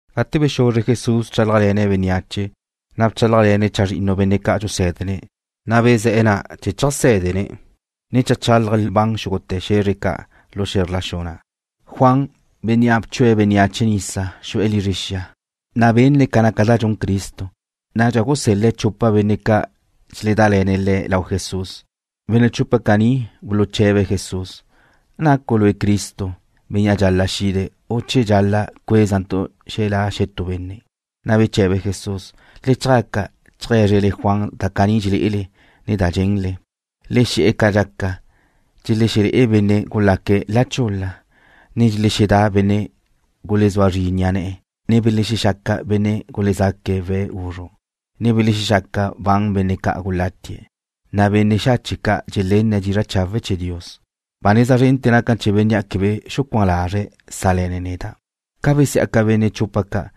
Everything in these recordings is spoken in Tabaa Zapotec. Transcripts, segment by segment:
Gate bexuzre Jesús bchálajle̱ne̱' bénneache, na' bchálajle̱ne̱' chazrinnu benne' ca' dxusé̱dene̱'. Bezé̱'e̱ na' chee̱ cheajsédene̱', ne cheajchálaje̱' lban xúgute̱ xe̱zre ca' lu xe̱zr la xu na'. Juan, bénnea' bchue̱' bénneache nisa, xu'e̱ lizre xia, na' benne̱' ca naca da dxun Cristo. Nadxa gusel-le̱' chupa benne' ca' dxeledále̱ne̱' le̱' lau Jesús. Benne' chupe̱' caní buluche̱be̱' Jesús: ―¿Nacu' Lue' Cristo, Bénnea' dxal-la' xide̱', u che dxal-la' cuézantu' xelá' xetú benne'? Na' beche̱be Jesús: ―Le chjaca cheajé̱zrele Juan da caní dxelé'ele, ne da dxenle. Le xe̱'e̱ ca dxaca, dxelexelé'e benne' gulaque̱' la chul-la. Dxelexedá benne' gulezúa zri ni'a ne̱'e̱. Belexexaca benne' gulezaque̱' we̱' guzru', ne belexexaca ban benne' ca' gulatie̱'. Benne' xache' ca' dxelenne̱' dizra' chawe' chee̱ Dios. Ba neza zrente̱ naca na chee̱ bénnea' quebe xucuán lazre̱' sále̱ne̱' neda'. Ca besí'aca benne' chupa ca',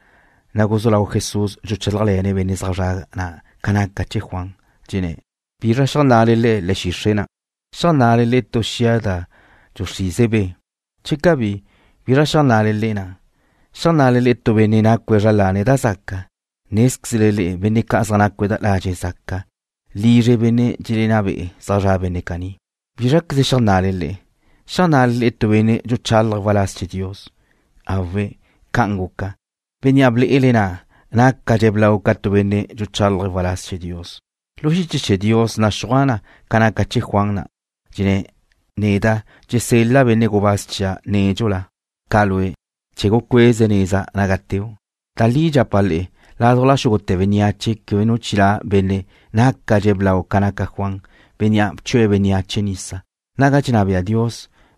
na' guzú lau Jesús dxuchálajle̱ne̱' benne' zaj zre̱'e̱ na' ca naca chee̱ Juan. Dxenné̱': ―¿Bizra xeajnna'le le'e le̱'e̱ xixre' na'? ¿Xeajnna'le tu xia da dxuxrize be'? Che cabí, ¿bizra xeajnna'le na'? ¿Xeajnna'le tu benne' nacue̱' zra lane̱' da zaca? Nézquezle benne' ca' zaj nácue̱' ladxe' zaca, lizre benne' dxelenná be'e̱ zaj zra' benne' caní. ¿Bízraqueze xeajnna'le? ¿Xeajnna'le tu benne' dxuchálaje̱' waláz chee̱ Dios? Awe'. Ca'an guca. Bénnea' ble'ele na' nácadxe̱' blau ca tu benne' dxuchálaje̱' waláz chee̱ Dios. Lu xiche chee̱ Dios naxúaj na ca naca chee̱ Juan na'. Dxenná na: Neda' dxesel-la' benne' gubáz chia' nédxula ca Lue', chee̱ gucueze̱' neza naga teu'. Da li dxapa' le'e, ládujla xúgute̱ bénneache quebe nu chilá' benne' nácadxe̱' blau ca naca Juan, bénnea' bchue̱' bénneache nisa. Naga dxenná bea Dios,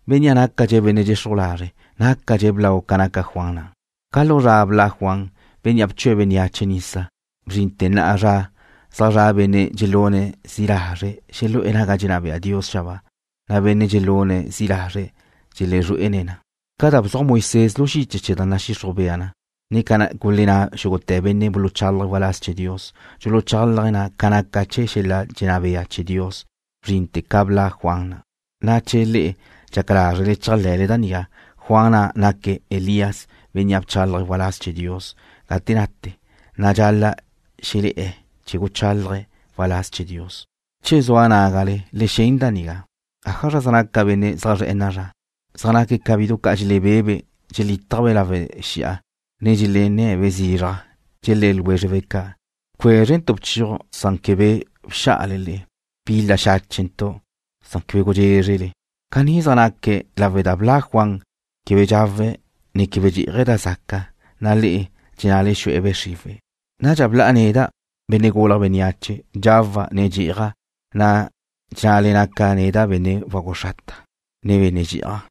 bénnea' nácadxe̱' benne' dxexruj lazre' nácadxe̱' blau ca naca Juan na'. ’Ca lu zra bla' Juan, bénnea' bchue̱' bénneache nisa, bzrinte̱ na'a zra, zaj zra' benne' dxelune̱' zi' lazre' xelu'e̱ naga dxenná bea Dios xabáa, na' benne' dxelune̱' zi' lazre' dxelezrué'ene̱' na. Ca da bzuaj Moisés lu xiche chee̱ da nadxixruj bea na, ne ca gulenná xúgute̱ benne' buluchálaje̱' waláz chee̱ Dios, dxuchalaj na ca naca chee̱ xel-la' dxenná bea chee̱ Dios, bzrinte̱ ca bla' Juan na'. Che le'e dxaca lázrele chéajle̱le da nigá, Juan na' naque̱' Elías, bénnea' bchálaje̱' waláz chee̱ Dios gate nate, na' dxal-la' xelé̱'e̱ chee̱ guchálaje̱' waláz chee̱ Dios. Che zua nágale, le xen da nigá. ’¿Ájazra zaj naca benne' zaj zre̱'e̱ na'a zra? Zaj naque̱' ca bidu ca' dxelebé'ebe' dxelítajbe' lawe' xi'a, ne dxelenne̱be' zizraj, dxelé̱ ljwézrebe' ca': “Bcuézrentu' bchiuj san quebe bxá'ale le'e. Bil-la xáchentu' san quebe gudxézrele.” Caní zaj naque̱' lawe' da bla' Juan, quebe dxawe̱', ne quebe dxí'aje̱' da zaca, na' le'e dxennale xu'e̱ be' xriwe̱'. Nadxa bla' neda', Benne' Gulje̱' Bénneache, dxawa', ne dxí'aja', na' dxennale naca' neda' benne' wagu xrata, ne benne' dxi'aj,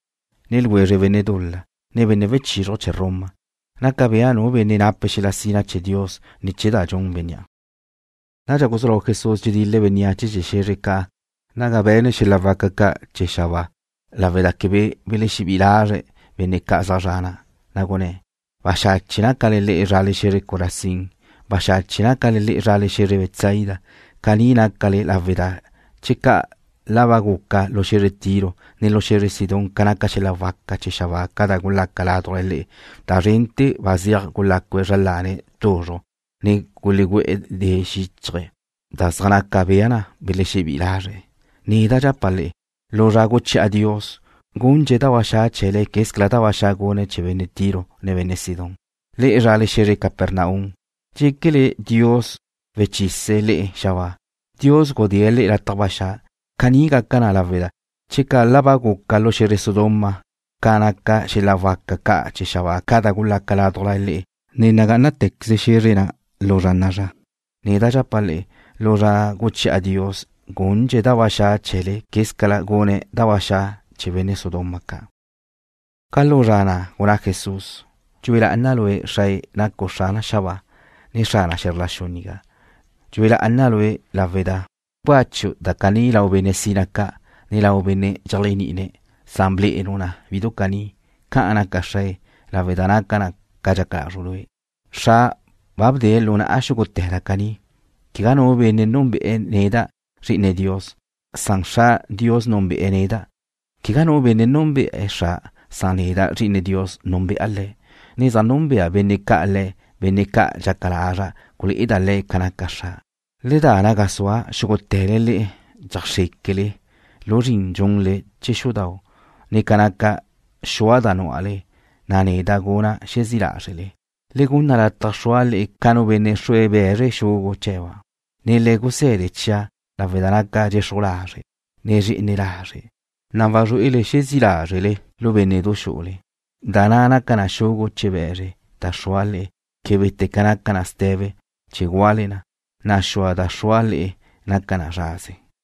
ne ljwezre benne' dul-la, ne benne' wechizruj chee̱ Roma. Naca bea nu benne' nape̱' xel-la' sina chee̱ Dios ne̱ chee̱ da dxun bénnea'. Nadxa guzú lau Jesús dxedil-le̱' bénneache chee̱ xe̱zre ca' naga be̱ne̱' xel-la' waca ca' chee̱ xabáa, lawe' da quebe belexebí'i lazre' benne' zaj zre̱'e̱ na'. Na' gunné̱': ―Baxache' nácale le'e zrale xe̱zre Corazín. Baxache' nácale le'e zrale xe̱zre Betsaida. Caní nácale lawe' da checa' la ba guca lu xe̱zre Tiro, ne lu xe̱zre Sidón ca naca xel-la' waca ca' chee̱ xabáa ca da gulaca ládujla le'e, da zrente̱ ba zeaj gulácue̱' zra lane̱' tuzruj, ne gulegú'e̱ de xíchaje̱' da zaj naca bea na belexebí'i lazre̱'. Neda' dxapa' le'e, lu zra guchi'a Dios, gundxe̱' da ba xa' chee̱le quez ca da ba xa' gune̱' chee̱ benne' Tiro, ne benne' Sidón. Le'e zrale xe̱zre Capernaum, ¿dxéquele Dios wechise̱' le'e xabáa? Dios gudée̱' le'e lataj ba xa'. Caní gaca na lawe' da checa' la ba guca lu xe̱zre Sodoma ca naca xel-la' waca ca' chee̱ xabáa ca da gulaca ládujla le'e, nagá'anate̱queze xe̱zre na' lu zra na'a zra. Neda' dxapa' le'e, lu zra guchi'a Dios, gundxe̱' da ba xa' chee̱le quez ca gune̱' da ba xa' chee̱ benne' Sodoma ca'. Ca lu zra na' gunná Jesús: ―Dxue lá'ana' Lue', Xrae, nacu' Xrana xabáa, ne Xrana xe̱zr la xu nigá. Dxue lá'ana' Lue' lawe' da bcácheu' da caní lau benne' sina ca', ne lau benne' dxeléajni'ine̱', san blé'enu' na bidu caní. Ca'an naca, Xrae, lawe' da naca na ca dxaca lazru' Lue'. ’Xra' ba bdee̱' lu na'a xúgute̱ da caní. Quegá nu benne' núnbe'e̱ neda', Zri'ine Dios, san Xra' Dios núnbe'e̱ neda'. Quegá nu benne' núnbe'e̱ Xra', san neda', Zri'ine Dios, núnbe'a Le̱', ne zaj núnbea benne' ca' Le̱', benne' ca' dxaca lazra' gulé'eda' le̱' ca naca Xra'. Le da naga zua', xúgute̱le le'e dxeajxréquele lu zrin dxunle chee̱ xudau', ne ca naca xua da núale, na' neda' guna' xezí' lázrele. Le gunna lataj xrua' le'e ca nu benne' xrue̱' be̱zre xugu' chee̱ba', ne le guse̱de chia' lawe' da naca' dxexruj lazre', ne dxe'ene lazre', na' wazrué'ele xezí' lázrele lu bénne'du xu'ule. Da na' naca na ca xugu' chee̱ be̱zre da xrua' le'e québete̱ ca naca na ste̱be chee̱ gúale na, na' xua da xrua' le'e naca na zraze.